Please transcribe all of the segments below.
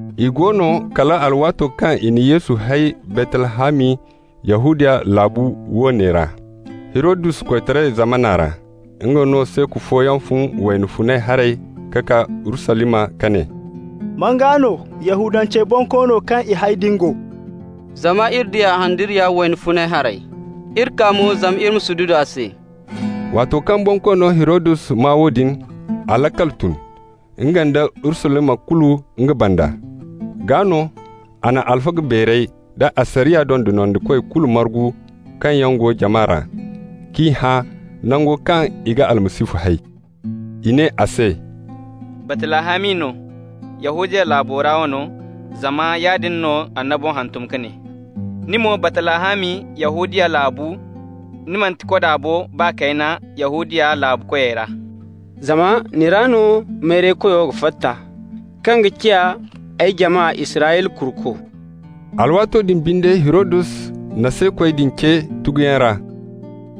I go no kala alwaato kaŋ i na Yesu hay Baytlahami, Yahudiya laabu wane ra, Hirodus koytaray zamana ra, nga no, seeku fooyaŋ fun wayna funay haray ka kaa Urusalima, ka ne: «Man gaa no Yahudancey bonkoono kaŋ i hay din go? Zama iri di a handariya wayna funay haray, iri kaa mo zama iri ma sududu a se.» Waato kaŋ Bonkoono Hirodus maa woodin, a laakal tun, nga nda Urusalima kulu nga banda. Gaa no, a na alfaga beerey da asariya dondonandikoy kulu margu kaŋ yaŋ go jama ra, k'i hã nango kaŋ i ga Almasihu hay. I ne a se: «Baytlahami no, Yahudiya laabu ra wano, zama yaadin no annabo hantum ka ne: ‹Ni mo, Baytlahami, Yahudiya laabu, ni manti koda bo baa kayna Yahudiya laabu koyey ra. Zama ni ra no mayraykoyo ga fatta kaŋ ga ciya ay jama Israyla kuruko.›» Alwaato din binde Hirodus na seekoy din ce tuguyaŋ ra,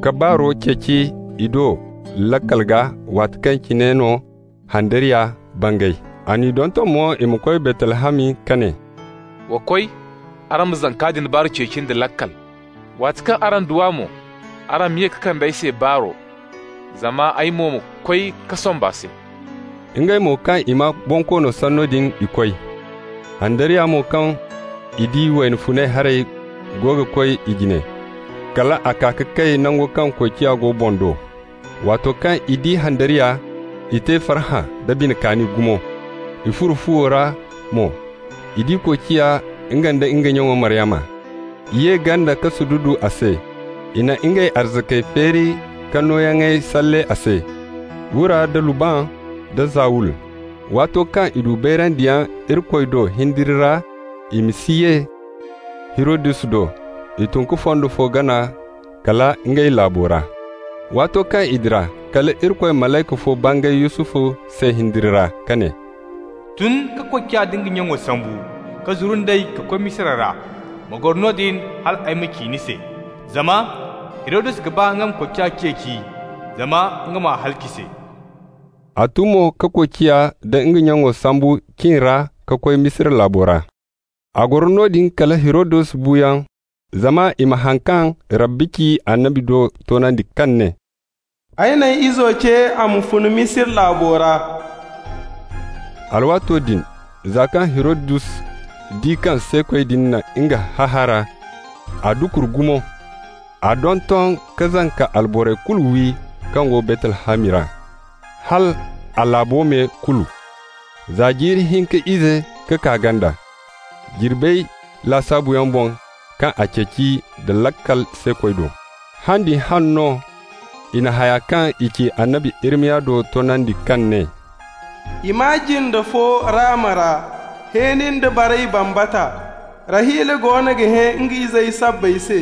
ka baaro ceeci i do laakal gaa waati kaŋ cine no handariya bangay. A n'i donton mo i ma koy Baytlahami, ka ne: «Wa koy. Araŋ ma zanka din baaru ceeci nda laakal. Waati kaŋ araŋ du a mo, araŋ ma ye ka kande ay se baaro, zama ay mo ma koy ka somb'a se.» Ngey mo, kaŋ i maa bonkoono sanno din, i koy. Handariya mo kaŋ i di wayna funay haray go ga koy i jine, kal a kaa ka kay nango kaŋ koociya go boŋ do. Waato kaŋ i di handariya, i te farhã da bine kaani gumo. I furo fuwo ra mo, i di koociya, nga nda nga nya Maryama. I ye ganda ka sududu a se. I na ngey arzakey feeri ka nooyaŋey salle a se: wura da lubban da zawul. Waato kaŋ i du bayrandiyaŋ Irikoy do hindiri ra i ma si ye Hirodus do, i tun ka fondo fo gana kala ngey laabo ra. Waato kaŋ i dira, kala Irikoy malayka fo bangay Yusufu se hindiri ra, ka ne: «Tun ka koociya da nga nyaŋo sambu, ka zuru nd'ey ka koy Misira ra. Ma goro noodin hal ay ma ci ni se. Zama Hirodus ga ba nga ma koociya ceeci zama nga m'a halaci se.» A tun mo ka koociya da nga nyaŋo sambu cin ra ka koy Misira laabo ra. A goro noodin kala Hirodus buuyaŋ, zama i ma haŋ kaŋ Rabbi ci annabi do toonandi, kaŋ ne: «Ay n'ay izo ce a ma fun Misira laabo ra.» Alwaato din za kaŋ Hirodus di kaŋ seekoy din na nga hahaara, a dukur gumo. A donton ka zanka alborey kulu wi kaŋ go Baytlahami ra, hal a laabo me kulu, za jiiri hinka ize ka kaa ganda, jirbey lasaabuyaŋ boŋ kaŋ a ceeci nda laakal seekoy do. Han din hane no i na haya kaŋ i ci annabi Irimiya do toonandi, kaŋ ne: «I maa jinde fo Rama ra, hẽeni nda baray bambata. Rahila goono ga hẽ nga izey sabbay se,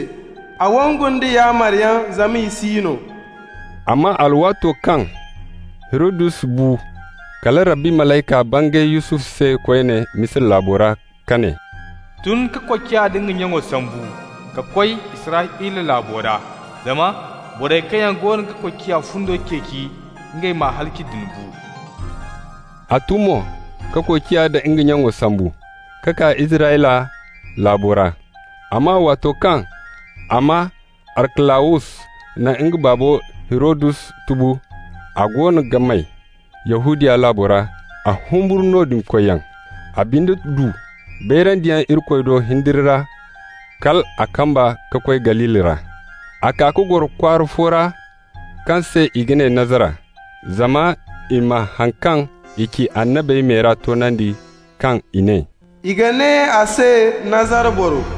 a wangu nda yaamaryaŋ, zama i si no.» Amma alwaato kaŋ Hirodus bu, kala Rabbi malayka bangay Yusufu se koyne Misira laabo ra ka ne: «Tun ka koociya da nga nyaŋo sambu, ka koy Israyla laabo ra, zama borey kaŋ yaŋ goono ga koociya fundo ceeci ngey m'a halaci din bu.» A tun mo, ka koociya da nga nyaŋo sambu, ka kaa Israyla laabo ra. Amma waato kaŋ a maa Arkalawus na nga baabo Hirodus tubu, a goono ga may Yahudiya laabo ra, a humburu noodin koyyaŋ. A binde du bayrandiyaŋ Irikoy do hindiri ra, kal a kamba ka koy Galili ra. A kaa ka goro kwaara fo ra kaŋ se i ga ne Nazara, zama i ma haŋ kaŋ i ci annabey me ra toonandi, kaŋ i ne: «I ga ne a se Nazara boro.»